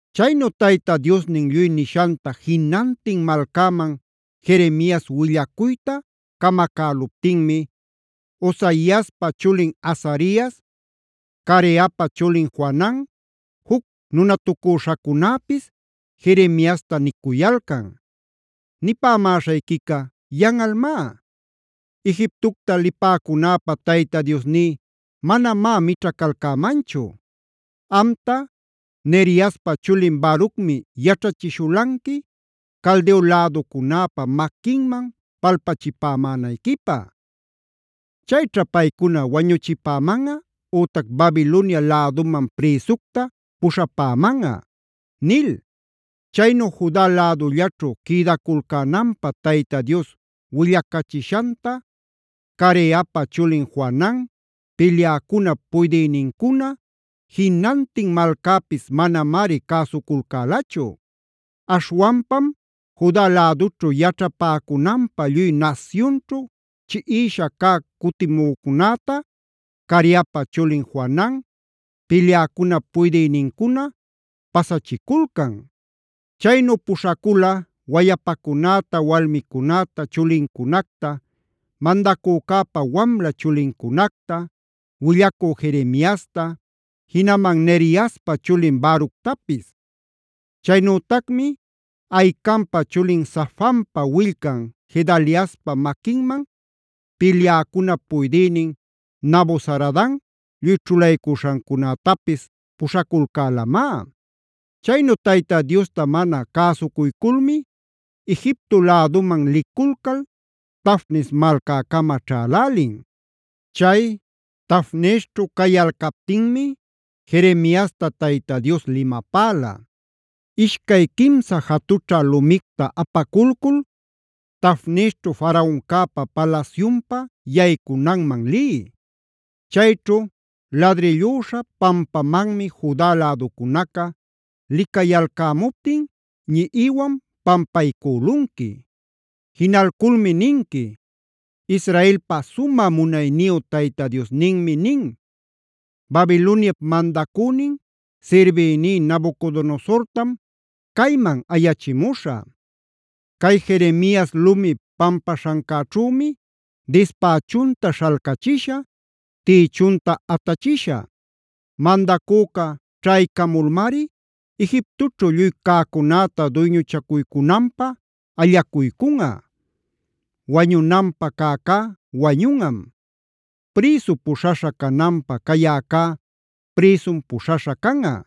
Chaynu Tayta Diosnin lluy nishanta jinantin malcäman Jeremias willacuyta camacäluptinmi, Osaiaspa chulin Azarias, Careapa chulin Johanan, juc nunatucüśhacunäpis Jeremiasta nicuyalcan: “Nipämäśhayquica yanꞌalmá. Egiptocta lipäcunäpä Tayta Diosní manamá mićhacalcämanchu. Amta, Neriaspa chulin Barucmi yaćhachishulanqui Caldeo läducunäpa maquinman palpachipämänayquipä. Chayćha paycuna wañuchipämanꞌa ütac Babilonia läduman prïsucta puśhapämanꞌa” nil. Chaynu Juda lädullaćhu quïdaculcänanpä Tayta Dios willacachishanta Careapa chulin Johanan, pilyäcunap puydïnincuna, jinantin malcäpis manamari cäsuculcälachu. Aśhwanpam Juda lädućhu yaćhapäcunanpä lluy nasyunćhu chiꞌisha cä cutimücunäta Careapa chulin Johanan, pilyäcunap puydïnincuna pasachiculcan. Chaynu puśhacula wayapacunäta, walmicunäta, chulincunacta, mandacücäpa wamla chulincunacta, willacü Jeremiasta, jinaman Neriaspa chulin Baructapis. Chaynütacmi Ahicampa chulin Safanpa willcan Gedaliaspa maquinman, pilyäcunap puydïnin Nabuzaradan lluy ćhulaycuśhancunätapis puśhaculcälamá. Chaynu Tayta Diosta mana cäsucuyculmi Egiptoa läduman liculcal Tafnes malcäcama ćhalälin. Chay Tafnesćhu cayalcaptinmi Jeremiasta Tayta Dios limapäla: “Ishcay quimsa jatućha lumicta apaculcul Tafnesćhu Faraoncäpa palasyunpa yaycunanman liy. Chayćhu ladrillüśha pampamanmi Juda läducunaca licayalcämuptin ñiꞌiwan pampaycülunqui. Jinalculmi ninqui: ‘Israelpa sumä munayniyu Tayta Diosninmi nin: Babiloniap mandacünin, sirbïní Nabucodonosortam cayman ayachimuśhä. Cay Jeremias lumi pampaśhancäćhümi dispächunta śhalcachishä, tïchunta atachishä. Mandacüca ćhaycamulmari Egiptoćhu lluy cäcunäta duyñuchacuycunanpä allacuycunꞌa: wañunanpä cäcá wañunꞌam; prïsu puśhaśha cananpä cayäcá prïsum puśhaśha canꞌa;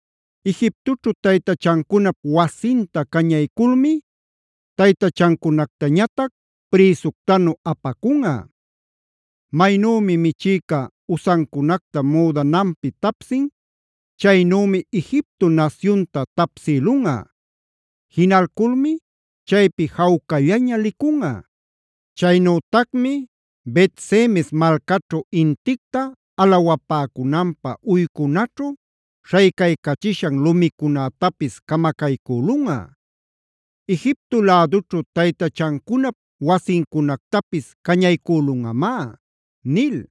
Egiptoćhu taytachancunap wasinta cañayculmi taytachancunactañatac prïsuctanu apacunꞌa. Maynümi michïca usancunacta müdananpi tapsin, chaynümi Egipto nasyunta tapsïlunꞌa. Jinalculmi chaypi jawcallaña licunꞌa. Chaynütacmi Bet-semes malcaćhu inticta alawapäcunanpä uycunanćhu śhaycachishan lumicunätapis camacaycülunꞌa. Egipto lädućhu taytachancunap wasincunactapis cañaycülunꞌamá’” nil.